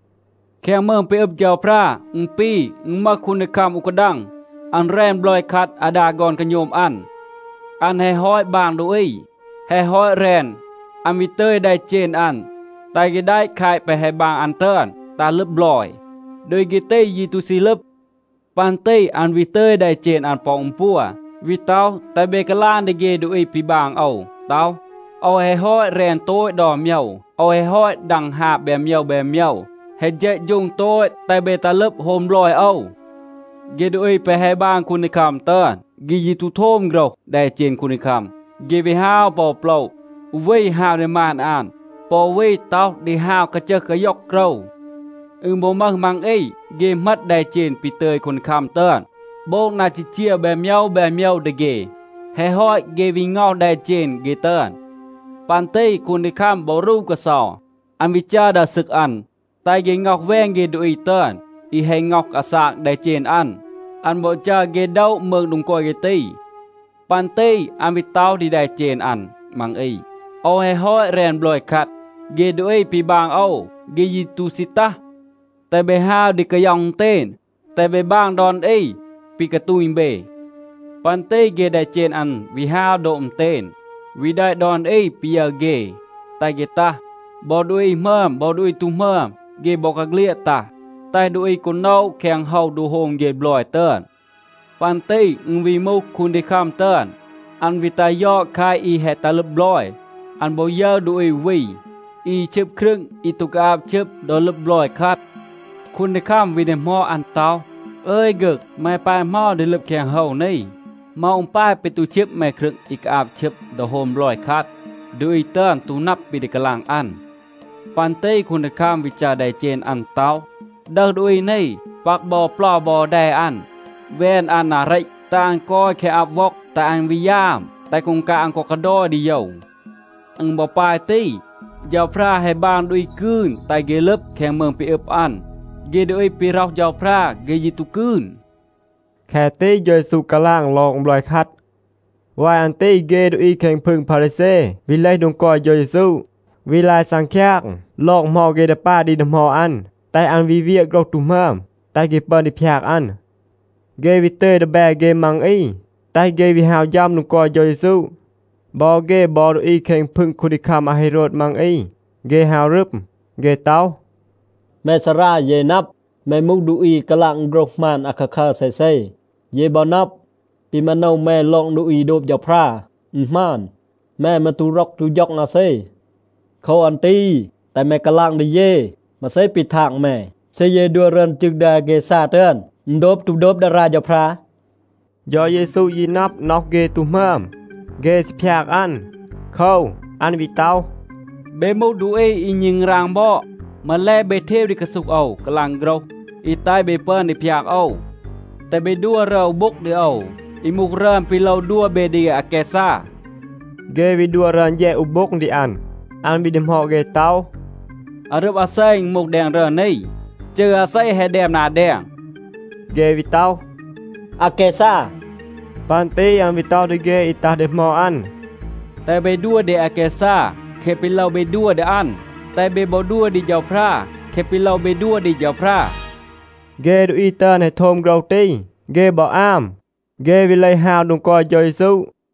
“แคง มืง ปี อึบ เฌาพรา อึณ ปี, อึณ มึห คูนดีคัม อู กาดัง. อัน แรน บลอย คัด อาดา ฆอน กาโณม อัน. อัน แฮะ ฮอต บาง ดูอี, แฮะ ฮอต แรน, อัน วี ตึย แดเจณ อัน, แตห เฆ แดะ แคต แปะ แฮะ บาง อัน ตึอน ตัห ลึบ บลอย. ดูอี เฆ ตี ยี ตู ซี ลึบ. ปัน ตี อัน วี ตึย แดเจณ อัน ปอ อึณ ปัว, วี ต็อห, แตห เบ กาลาง ดี เฆ ดูอี ปี บาง โอว ต็อห, ‘โอว แฮะ ฮอต แรน โตต ดอน โมยว. โอว แฮะ ฮอต ดัง ฮาบ แบน โมยว แบน โมยว. แฮะ เฌะฌูง โตต. แตห เบ ตัห ลึบ โฮม บลอย โอว.’ เฆ ดูอี แปะ แฮะ บาง คูนดีคัม ตึอน, เฆ ยี ตู โทม โฆรห แดเจณ คูนดีคัม. เฆ วี ฮาว ปอ อู โปละ. อู วี ฮาว ดี มาน อัน, ปอ อู วี ต็อห ดี ฮาว กาจึห กาย็อง โกรว. อึณ บอ มึห มัง อี, เฆ เหมต แดเจณ ปี ตึย คูนดีคัม ตึอน, โบง นา จีจีว แบน โมยว แบน โมยว ดี เฆ. แฮะ ฮอต, เฆ วี ง็อห แดเจณ เฆ ตึอน. ปัน ตี คูนดีคัม บอ รู กาเซา. อัน วี จัร ดา ซึก อัน, แตห เฆ ง็อห แวน เฆ ดูอี ตึอน, อี แฮะ ง็อห อาซาก แดเจณ อัน. อัน บอ จัร เฆ โดะ มืง โดง กอย เฆ ตี. ปัน ตี อัน วี ต็อห ดี แดเจณ อัน มัง อี, ‘โอว แฮะ ฮอต แรน บลอย คัด. เฆ ดูอี ปี บาง โอว, เฆ ยี ตู ซี ตัห. แตห เบ ฮาว ดี กาย็อห อึณเตณ, แตห เบ บาง ดอน อี ปี กาตูณ เบ.’ ปัน ตี เฆ แดเจณ อัน วี ฮาว โดบ อึณเตณ, วี แดะ ดอน อี ปี ยึร เฆ, แตห เฆ ตัห. บอ ดูอี หมึอม บอ ดูอี ตู หมึอม, เฆ บอกาเฆลียด ตัห, แตห ดูอี กอ โนะ แคง โฮว โดง โฮม เฆ บลอย ตึอน. ปัน ตี อึณ วี มูห คูนดีคัม ตึอน, อัน วี ตัห ยอด แคต อี แฮะ ตัห ลึบ บลอย. อัน บอ ยึร ดูอี อู วี, อี ชึบ ครึง อี ตู กาอาบ ชึบ ดอ ลึบ บลอย คัด. คูนดีคัม วี ดีหมอด อัน ต็อห, ‘อึย ฆึก, แม ปาย เหมา ดี ลึบ แคง โฮว นี? เหมา อึณ ปาย ปี ตู ชึบ แม ครึง อี กาอาบ ชึบ ดอ โฮม บลอย คัด?’ ดูอี ตึอน ตู นับ ปี ดี กาลาง อัน. ปัน ตี คูนดีคัม วี จัร แดเจณ อัน ต็อห, ‘ดึห ดูอี นี, ปัก บอ เปลา บอ แด อัน, แวน อัน นา เรต, แตห อัน กอย แคง อับ ว็อง, แตห อัน วี ยาม, แตห กูงกาบ อัน กอ กาดอย ดี โยว.’ อึณ บอ ปาย ตี. เฌาพรา แฮะ บาง ดูอี กืน, แตห เฆ ลึบ แคง มืง ปี อึบ อัน. เฆ ดูอี ปี ร็อห เฌาพรา, เฆ ยี ตู กืน.” แคะ ตี เฌา เยซู กาลาง ลอง บลอย คัด.a วาย อัน ตี เฆ ดูอี แคง พึง พารีแซ วี เลห โดง กอย เฌา เยซู, วี ลาย ซังคยาง ลอง เหมา เฆ ดี ปาย ดี ดีหมอด อัน, แตห อัน วี เวียะ โฆรห ตู หมึอม, แตห เฆ ปึอน ดี พยาก อัน. เฆ วี ตึย ดีแบ เฆ มัง อี แตห เฆ วี ฮาว ฌัม โดง กอย เฌา เยซู. บอ เฆ บอ ดูอี แคง พึง คูนดีคัม อาเฮโรด มัง อี, เฆ ฮาว รึม. เฆ ต็อห, “แม ซารา, เย นับ, แม มูห ดูอี อี กาลาง โฆรห หมาน อาคาคัร เซเซ. เย บอ นับ, ปี มาโนว แม ลอง ดูอี โดบ เฌาพรา, อึณ หมาน. แม มืร ตู ร็อก ตู ฌ็อง อาเซ. โคว อัน ตี แตห แม กาลาง ดี เย, มาเซ ปี ทาง แม. เซ เย ดัว รึอน จึง ดี อาแกซา ตึอน, อึณ โดบ ตู โดบ ดารา เฌาพรา?” เฌา เยซู ยี นับ, น็อห เฆ ตู หมึอม. เฆ ซี พยาก อัน. โคว, อัน วี ต็อห, “เบ มูห ดูอี อี ณึงราง บอด. มาแล เบ เทว ดี กาซูห โอว กาลาง โฆรห อี แตห เบ ปึอน ดี พยาก โอว.b แตห เบ ดัว รึอน อู โบ็ง ดี โอว, อี มูห รึอน ปี โลว ดัว เบ ดี อาแกซา.” เฆ วี ดัว รึอน แฌด อู โบ็ง ดี อัน. อัน วี ดีหมอด เฆ ต็อห, “อารึบ อาเซ อึณ มูห แดง รึอน นี? จืร อาเซ แฮะ แดม นา แดง?” เฆ วี ต็อห, “อาแกซา.” ปัน ตี อัน วี ต็อห ดี เฆ อี ตัห ดีหมอด อัน, “แตห เบ ดัว ดี อาแกซา แคะ ปี โลว เบ ดัว ดี อัน. แตห เบ บอ ดัว ดี เฌาพรา แคะ ปี โลว เบ ดัว ดี เฌาพรา.” เฆ ดูอี ตึอน แฮะ โทม โฆรห ตี, เฆ บอ อาม. เฆ วี เลห ฮาว โดง กอย เฌา เยซู.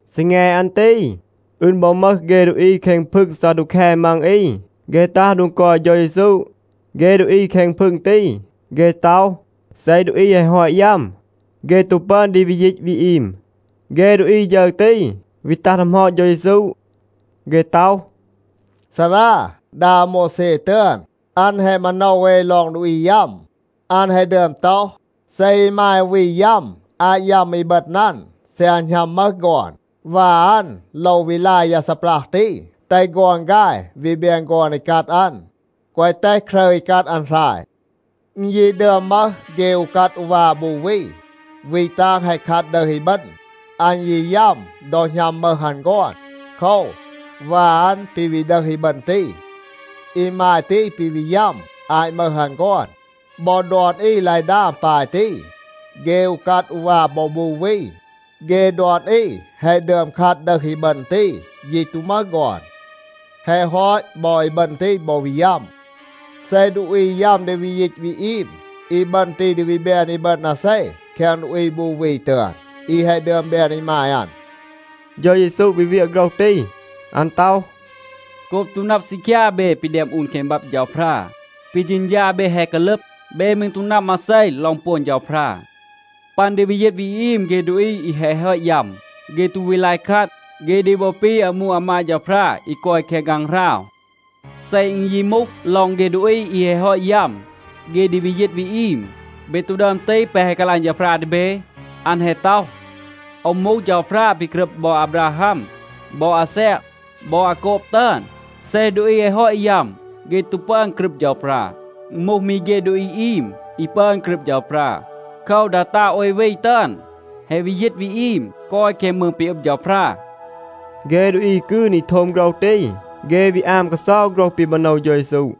ซีแง อัน ตี, อึณ บอ มึห เฆ ดูอี แคง พึง ซาดูแค มัง อี, เฆ ตัห โดง กอย เฌา เยซู. เฆ ดูอี แคง พึง ตี, เฆ ต็อห, เซ ดูอี แฮะ ฮอต ยัม, เฆ ตู ปึอน ดี วี ยีต วี อีม. เฆ ดูอี ฌึร ตี วี ตัห ดีหมอด เฌา เยซู. เฆ ต็อห, “ซารา, ดา อาโมวแซ ตึอน, อัน แฮะ มาโนว เอ ลอง ดูอี ยัม. อัน แฮะ ดึอม ต็อห, เซ อีมาย อู วี ยัม อาต ยัม อีบึณ อัน, เซ อัน หณัม มึห ฆอน, วา อัน โลว วี ลาย ยา ซีปรัห ตี, แตห ฆอน ฆาย วี แบน ฆอน อีกัด อัน, แกวะ แตห ครึร อีกัด อัน หราย. อึณ ยี ดึอม มึห เฆ อูกัด อูวา บู วี. วี ตาง แฮะ คัด ดึห อีบึณ. อัน ยี ยัม ดอ หณัม มึห อัน ฆอน. โคว, วา อัน ปี วี ดึห อีบึณ ตี. อีมาย ตี ปี วี ยัม อาต มึห อัน ฆอน. บอ ดอน อี ลาย ดาม ปาย ตี. เฆ อูกัด อูวา บอ บู วี, เฆ ดอน อี แฮะ ดึอม คัด ดึห อีบึณ ตี, ยี ตู มึห ฆอน. แฮะ ฮอต, บอ อีบึณ ตี บอ วี ยัม. เซ เฆ ดูอี ยัม ดี วี ยีต วี อีม, อีบึณ ตี ดี วี แบน อีบึณ อาเซ แคง ดูอี บู วี ตึอน, อี แฮะ ดึอม แบน อีมาย อัน?” เฌา เยซู วี เวียะ โฆรห ตี. อัน ต็อห, “โกบ ตู นับ ซีคยา เบ ปี แดม อูน แคง บับ เฌาพรา, ปี เฌณฌา เบ แฮะ กาลึบ. เบ มืร ตู นับ มาเซ ลอง ปวน เฌาพรา. ปัน ดี วี ยีต วี อีม เฆ ดูอี อี แฮะ ฮอต ยัม, เฆ ตู วี ลาย คัด. เฆ ดี บอ ปี อามู อามาด เฌาพรา อี กอย แคง ฆางหราว. เซ อึณ ยี มูห ลอง เฆ ดูอี อี แฮะ ฮอต ยัม, เฆ ดี วี ยีต วี อีม, เบ ตู ดึอม ตีห แปะ แฮะ กาลาง เฌาพรา ดี เบ? อัน แฮะ ต็อห, ‘โอว มูห เฌาพรา ปี กรึบ บอ อาบราฮัม บอ อาแซก บอ อาโกบ ตึอน.’c เซ ดูอี แฮะ ฮอต ยัม, เฆ ตู ปึอน กรึบ เฌาพรา. อึณ มูห มี เฆ ดูอี อีม, อี ปึอน กรึบ เฌาพรา. โคว, ดา ตาง โอย วี ตึอน แฮะ วี ยีต วี อีม, กอย แคง มืง ปี อึบ เฌาพรา.” เฆ ดูอี กืน อี โทม โฆรห ตี, เฆ วี อาม กาเซา โฆรห ปี มาโนว เฌา เยซู.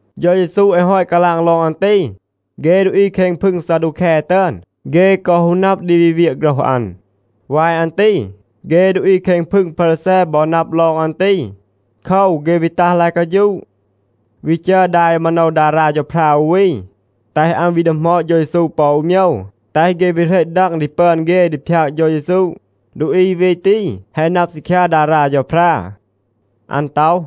เฌา เยซู แฮะ ฮอต กาลาง ลอง อัน ตี, เฆ ดูอี แคง พึง ซาดูแค ตึอน, เฆ กอ ฮู นับ ดี วี เวียะ โฆรห อัน. วาย อัน ตี, เฆ ดูอี แคง พึง พารีแซ บอ นับ ลอง อัน ตี. โคว, เฆ วี ตัห ลาย กาฌูะ, วี จัร ดา อี มาโนว ดารา เฌาพรา อู วี, แตห อัน วี ดีหมอด เฌา เยซู ปอ อู โมยว, แตห เฆ วี เหรต ดัง ดี ปึอน เฆ ดี พยาก เฌา เยซู. ดูอี วี ตี แฮะ นับ ซีคยา ดารา เฌาพรา. อัน ต็อห,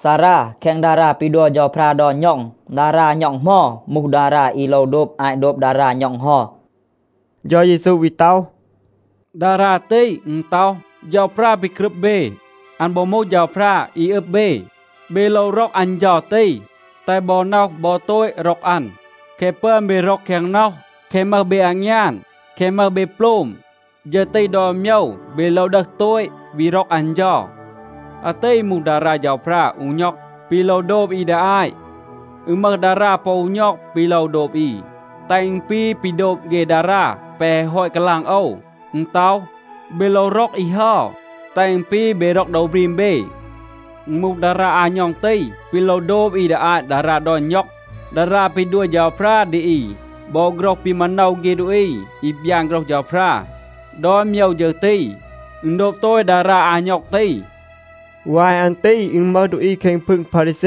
“ซารา, แคง ดารา ปี ดัว เฌาพรา ดอน ณ็อง, ดารา ณ็อง เหมา มูห ดารา อี โลว โดบ อาต โดบ ดารา ณ็อง เฮา?” เฌา เยซู วี ต็อห, “ดารา ตี, อึณ ต็อห, ‘เฌาพรา ปี กรึบ เบ, อัน บอ มูห เฌาพรา อี อึบ เบ. เบ โลว ร็อก อัน เฌา ตี, แตห บอ น็อห บอ โตต ร็อก อัน. แคะ ปึอน เบ ร็อก แคง น็อห, แคะ มึห เบ อางยาน, แคะ มึห เบ โปลม, ฌึร ตี ดอน โมยว เบ โลว ดึห โตต, วี ร็อก อัน เฌา.’ อาตี มูห ดารา เฌาพรา อู ณ็อง, ปี โลว โดบ อี ดี อาต. อึณ มึห ดารา ปอ อู ณ็อง ปี โลว โดบ อี, แตห อึณ ปี ปี โดบ เฆ ดารา แปะ แฮะ ฮอต กาลาง โอว. อึณ ต็อห, ‘เบ โลว ร็อก อี เฮา, แตห อึณ ปี, เบ ร็อก โดว บรีม เบ.’ อึณ มูห ดารา อา ณ็อง ตี, ปี โลว โดบ อี ดี อาต ดารา ดอน ณ็อง. ดารา ปี ดัว เฌาพรา ดี อี บอ โฆรห ปี มาโนว เฆ ดูอี อี บยาน โฆรห เฌาพรา, ดอน โมยว ฌึร ตี, อึณ โดบ โตต ดารา อา ณ็อง ตี.” วาย อัน ตี อึณ มึห ดูอี แคง พึง พารีแซ.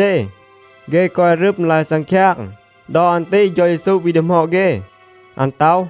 เฆ กอย รึม, ลาย ซังคยาง. ดอ อัน ตี เฌา เยซู วี ดีหมอด เฆ. อัน ต็อห,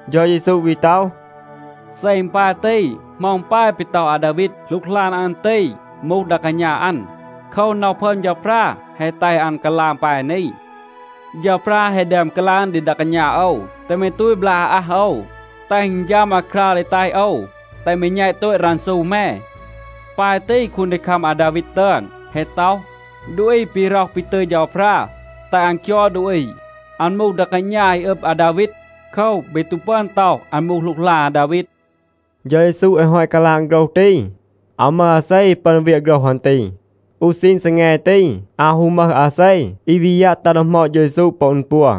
เฌา เยซู วี ต็อห, “เซ อึณ ปาย ตี, เหมา อึณ ปาย ปี ต็อห อาดาวีด, หลูกหลาน อัน ตี มูห ดา กาณา อัน? โคว, น็อห พึอม เฌาพรา แฮะ แตห อัน กาลาง ปาย นี, ‘เฌาพรา แฮะ ดึอม กาลาง ดี ดา กาณา โอว, “แตห แม ตูต บลาก อาอัห โอว, แตห อึณ ฌัม อาคราว ดี แตห โอว แตห แม แณต โตต รันซู แม.”’ ปาย ตี, คูนดีคัม อาดาวีด ตึอน แฮะ ต็อห, ดูอี ปี ร็อห ปี ตึย เฌาพรา แตห อัน คยอด ดูอี, อัน มูห ดา กาณา อี อึบ อาดาวีด. โคว, เบ ตู ปึอน ต็อห, อัน มูห หลูกหลาน อาดาวีด.” เฌา เยซู แฮะ ฮอต กาลาง โฆรห ตี, อาว มึห อาเซ อี ปึอน เวียะ โฆรห อัน ตี. อู ซีณ ซีแง ตี, อาว ฮู มึห อาเซ อี วี ยัะ ตัห ดีหมอด เฌา เยซู ปอ อึณ ปัว.